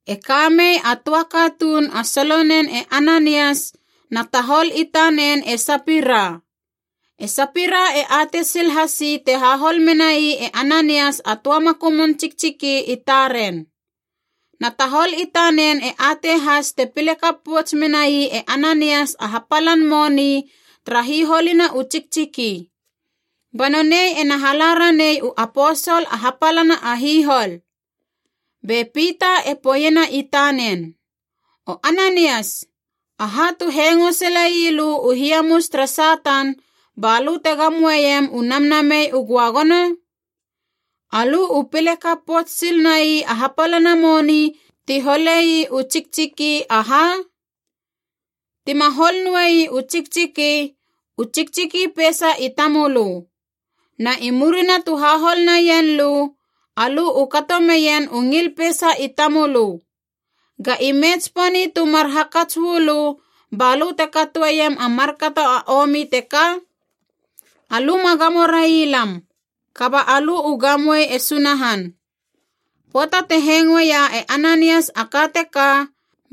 E kamei a töa katuun a solonen e Ananias, na tahol i tanen e Sapira. E Sapira e atei sil hasi te hahol menai e Ananias a töa makumun tsiktsiki i taren. Na tahol i tanen e atei has te pile kap pouts menai e Ananias a hapalan moni tara hiholina u tsiktsiki. Ba nonei ena hala ranei u aposol a hapalana a hihol. Be Pita e poeiena i tanen, “O Ananias, aha tu hengo sile ii lö u hiamus tere Satan balö te gamoeiem u Namnamei u Göagono? Alö u pile kap pouts sil nai a hapalana moni ti hole ii u tsiktsiki, aha? Tima hol noei u tsiktsiki, u tsiktsiki peisa i tamölö. Na i murina tu hahol naien lö, alö u kato meien u ngil peisa i tamölö. Ga ime tsiponi tu mar hakats uu lö balö te katoeiem a markato a omi teka? Alö ma gamo rai lam, kaba alö u gamoe e Sunahan.” Pöata te hengoeia e Ananias a ka teka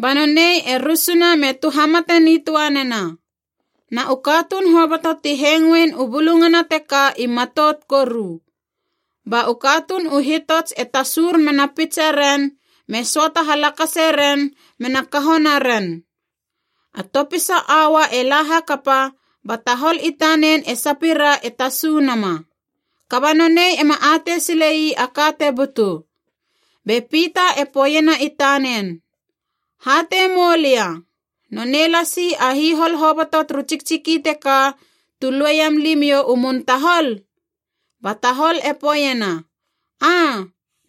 ba nonei e rusuna me tuhamate nitöa nena. Na u katuun hoboto ti hengoein u bulungana teka i matout koru. Ba u katuun u hitots e tasur mena pitseren, me söata halakase ren mena kaho naren. A topisa aua e la hakapa ba tahol i tanen e Sapira e tasu nama. Kaba nonei ema atei sile ii a ka te butu. Be Pita e poeiena i tanen, “Hatei moulia, nonei lasi a hihol hoboto turu tsiktsiki teka tu lueiam limiou u mun tahol?” Ba tahol e poeiena, “Aa,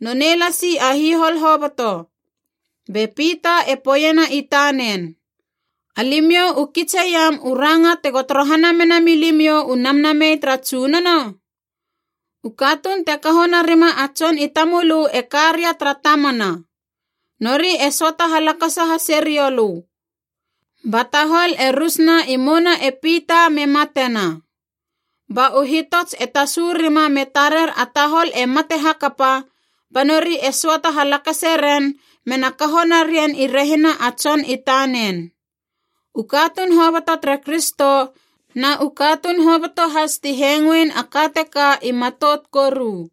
nonei lasi a hihol hoboto.” Be Pita e poeiena i tanen, “Alimiou u kitseiam u ranga tego torohana mena milimiou u Namnamei tara Tsunono? U katuun te kaho narima a tson i tamölö e ka ria tara tamana. Nori e söata halakasa hase riou lö!” Ba tahol e rus na i mouna e Pita me matena. Ba u hitots e tasu rima me tarer a tahol e mate hakapa, ba nori e söata halakase ren mena kaho narien i rehina a tson i tanen. U katuun hoboto tere Kristo na u katuun hoboto has ti hengoein a ka teka i matout koru.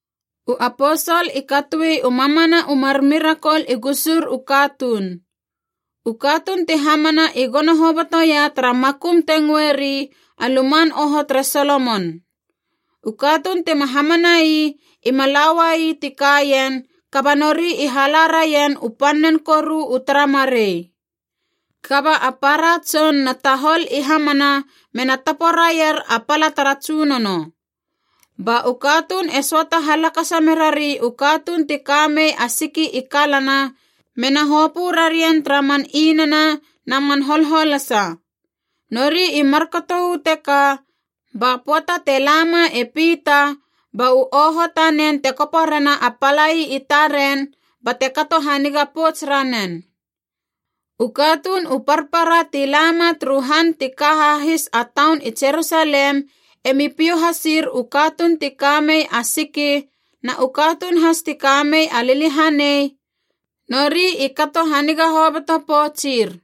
U aposol i katoi u mamana u mar mirakol i gusur u katuun. U katuun ti hamana i gono hobotoia tara makum te ngöeri a Luman Oho tere Solomon. U katuun tima hamana ii ima la ua ii ti kaien kaba nori i hala raien u pannen koru u tara marei. Kaba a para tson na tahol i hamana mena tapo raier a pala tara Tsunono. Ba u katuun e söata halakasa merari u katuun ti ka mei a siki i kalana mena hopö rarien tara man inana na man holholasa. Nori i markato uu teka ba pöata te la ma e Pita ba u oho tanen te kopo rena a palai i taren bate kato haniga pouts ranen. U katuun u parpara ti lama turu han ti ka hahis a taun i Jerusalem emi piou hasir u katuun ti ka mei a siki na u katuun has ti ka mei a liliahanei, nori i kato haniga hoboto poutsir.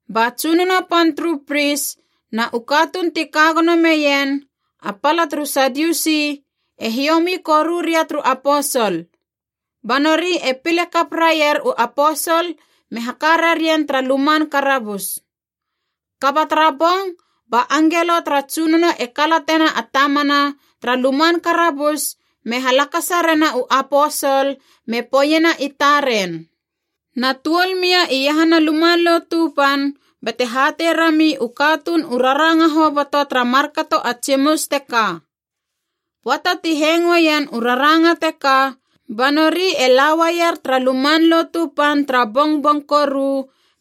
Ba tsunono pan turu pris na u katuun ti ka gono meien, a pala turu Sadiusi, e hiomi koru ria turu aposol. Ba nori e pile kap raier u aposol me haka rarien tara luman karabus. Kaba tara bong ba angelo tara Tsunono e kalatena a tamana tara luman karabus me halakasa rena u aposol me poeiena i taren, “Na tuol mia iahana Luman Lotu Pan bate hatei rami u katuun u raranga hoboto tara markato a tsimus teka.” Pöata ti hengoeien u raranga teka, ba nori e la uaier tara Luman Lotu Pan tara bongbong koru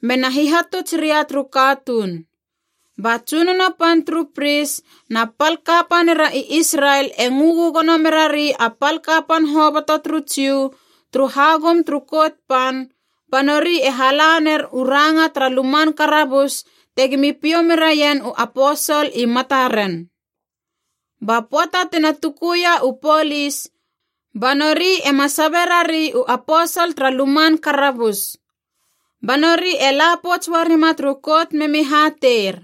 mena hihatuts ria turu katuun. Ba tsunono pan turu pris na pal kapanira i Israel e ngö gögono merari a pal kapan hoboto turu Jiu turu hagum turu Kout Pan, ba nori e hala ner u ranga tara luman karabus tegimi piou meraien u aposol i mataren. Ba pöata tina tukuia u polis, ba nori ema sabe rari u aposol tara luman karabus. Ba nori e la pouts uarima turu Kout memi hateir,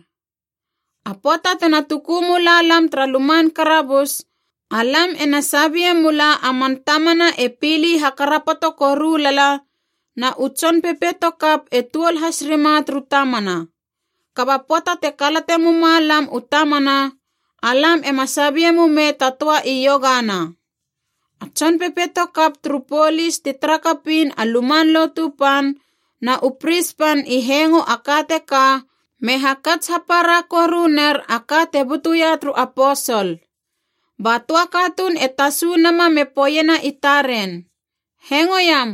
“A pöata tena tuku mula lam tara luman karabus, alam ena sabie mula a man tamana e pili hakarapoto koru lala, na u tson pepeito kap e tuol has rima turu tamana. Kaba pöata te kalate muma lam u tamana, alam ema sabie mumei ta töa iogana.” A tson pepeito kap turu polis ti tara kapiin a Luman Lotu Pan na u pris pan i hengo a ka teka me hakats hapara koru ner a ka te butuia turu aposol. Ba töa katuun e tasu nama me poeiena i taren, “Hengoiam!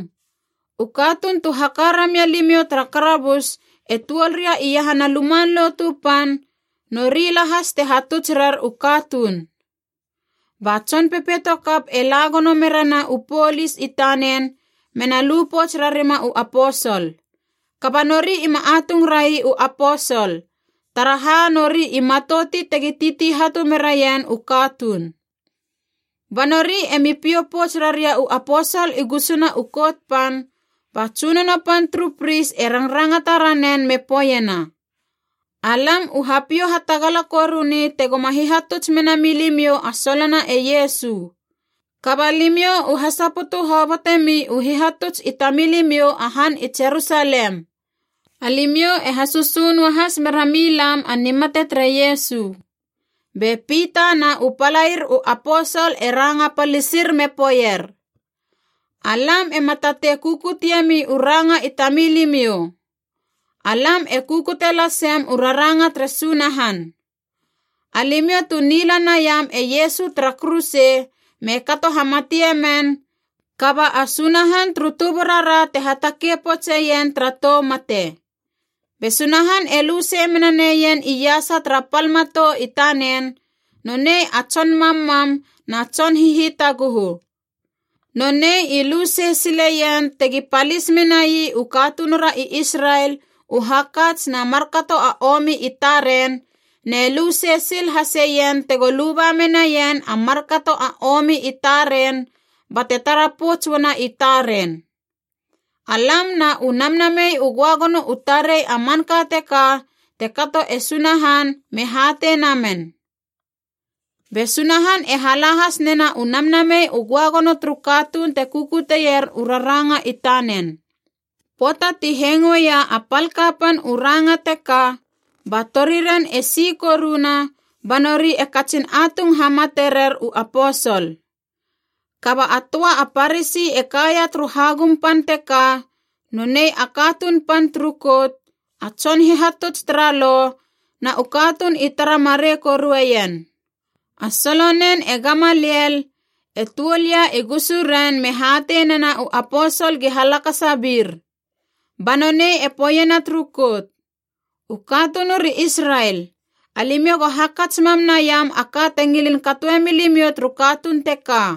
U katuun tu haka ramia limiou tara karabus e tuol ria iahana Luman Lotu Pan, nori lahas te hatuts rer u katuun!” Ba tson pepeito kap e la gono merena u polis i tanen mena lu pouts rarima u aposol. Kaba nori ima atung rai u aposol, taraha nori i matouti tegi titi hatu meraien u katuun. Ba nori emi piou pouts raria u aposol i gusuna u Kout Pan, ba tsunono pan turu pris e rangrangata ranen me poeiena, “Alam u hapiou hatagala koruni tegoma hihatuts mena milimiou a solona e Iesu. Kaba limiou u hasaputu hobotemi u hihatuts i tamilimiou a han i Jerusalem. Alimiou e hasösö noahas mera milam a nimate tere Iesu.” Be Pita na u palair u aposol e ranga palisir me poeier, “Alam ema tatei kukutiemi u ranga i tamilimiou! Alam e kukute lasem u raranga tere Sunahan. Alimiou tu nila naiam e Iesu tara kuruse me kato hamatie men, kaba a Sunahan turu tuburara te hatakei poutseien tara tou mate. Be Sunahan e lu sei mena neien iasa tara pal matou i tanen, nonei a Tson Mammam na Tson Hihitaguhu. Nonei i lu sei sileien tegi palis menai u katunura i Israel u hakats na markato a omi i taren, ne lu sei sil haseien tego luba menaien a markato a omi i taren bate tara pouts uana i taren. Alam na u Namnamei u Göagono u tarei a manka teka te kato e Sunahan me hatei namen. Be Sunahan e hala has nena u Namnamei u Göagono turu katuun te kukutier u raranga i tanen.” Pöata ti hengoeia a pal kapan u ranga teka, ba toriren e si koruna ba nori e katsin atung hamate rer u aposol. Kaba a töa a Parasi e kaia turu hagum pan teka, nonei a katuun pan turu Kout, a tson hihatuts tara Lo, na u katuun i tara marei korueien. A solonen e Gamaliel, e tuol ia i gusuren me hatei nena u aposol gi halakasa bir. Ba nonei e poeiena turu Kout, “U katunur i Israel, alimiou go hakats mam naiam a ka te ngilin katoe milimiou turu katuun teka.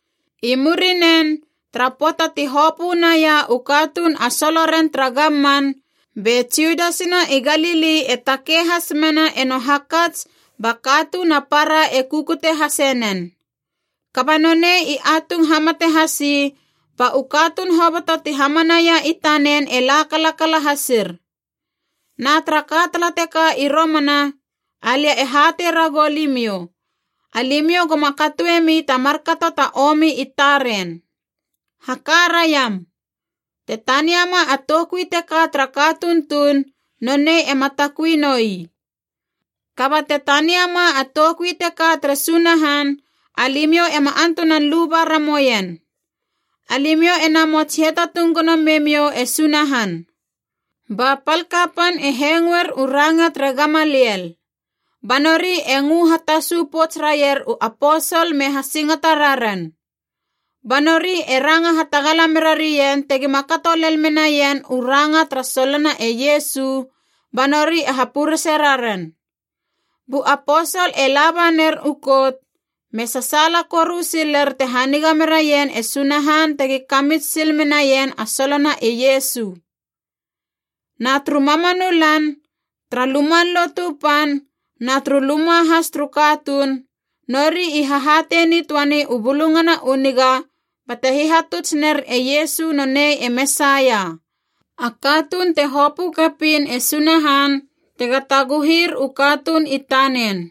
I murinen, tara pöata ti hopö naia u katuun a soloren tara gamman, be Judas na i Galili e takei has mena eno hakats ba katuun a para e kukute hasenen. Kaba nonei i atung hamate hasi, ba u katuun hoboto ti hamanaia i tanen e la kalakala hasir. Na tara ka tala teka i romana, alia e hatei ragou limiou, alimiou goma katoemi ta markato ta omi i taren. Haka raiam. Te taniama a toukui teka tara katuun tuun, nonei ema takui noi. Kaba te taniama a toukui teka tere Sunahan, alimiou ema antunan luba ramoien. Alimiou e namots hiatatung gono me miou e Sunahan!” Ba pal kapan e hengoer u ranga tere Gamaliel. Ba nori e ngö hatasu pouts raier u aposol me hasingata raren. Ba nori e ranga hatagala mera rien tegima kato lel menaien u ranga tara solona e Iesu, ba nori e hapurese raren. Bu aposol e laba ner u Kout, me sasaala koru siler te haniga meraien e Sunahan tegi kamits sil menaien a solona e Iesu. Na turu mamanu lan, tara Luman Lotu Pan na turu luma has turu katuun, nori i hahatei nitöani u Bulungana u Niga bate hihatuts ner e Iesu nonei e Mesaia, a katuun te hopö kapiin e Sunahan tega taguhir u katuun i tanen.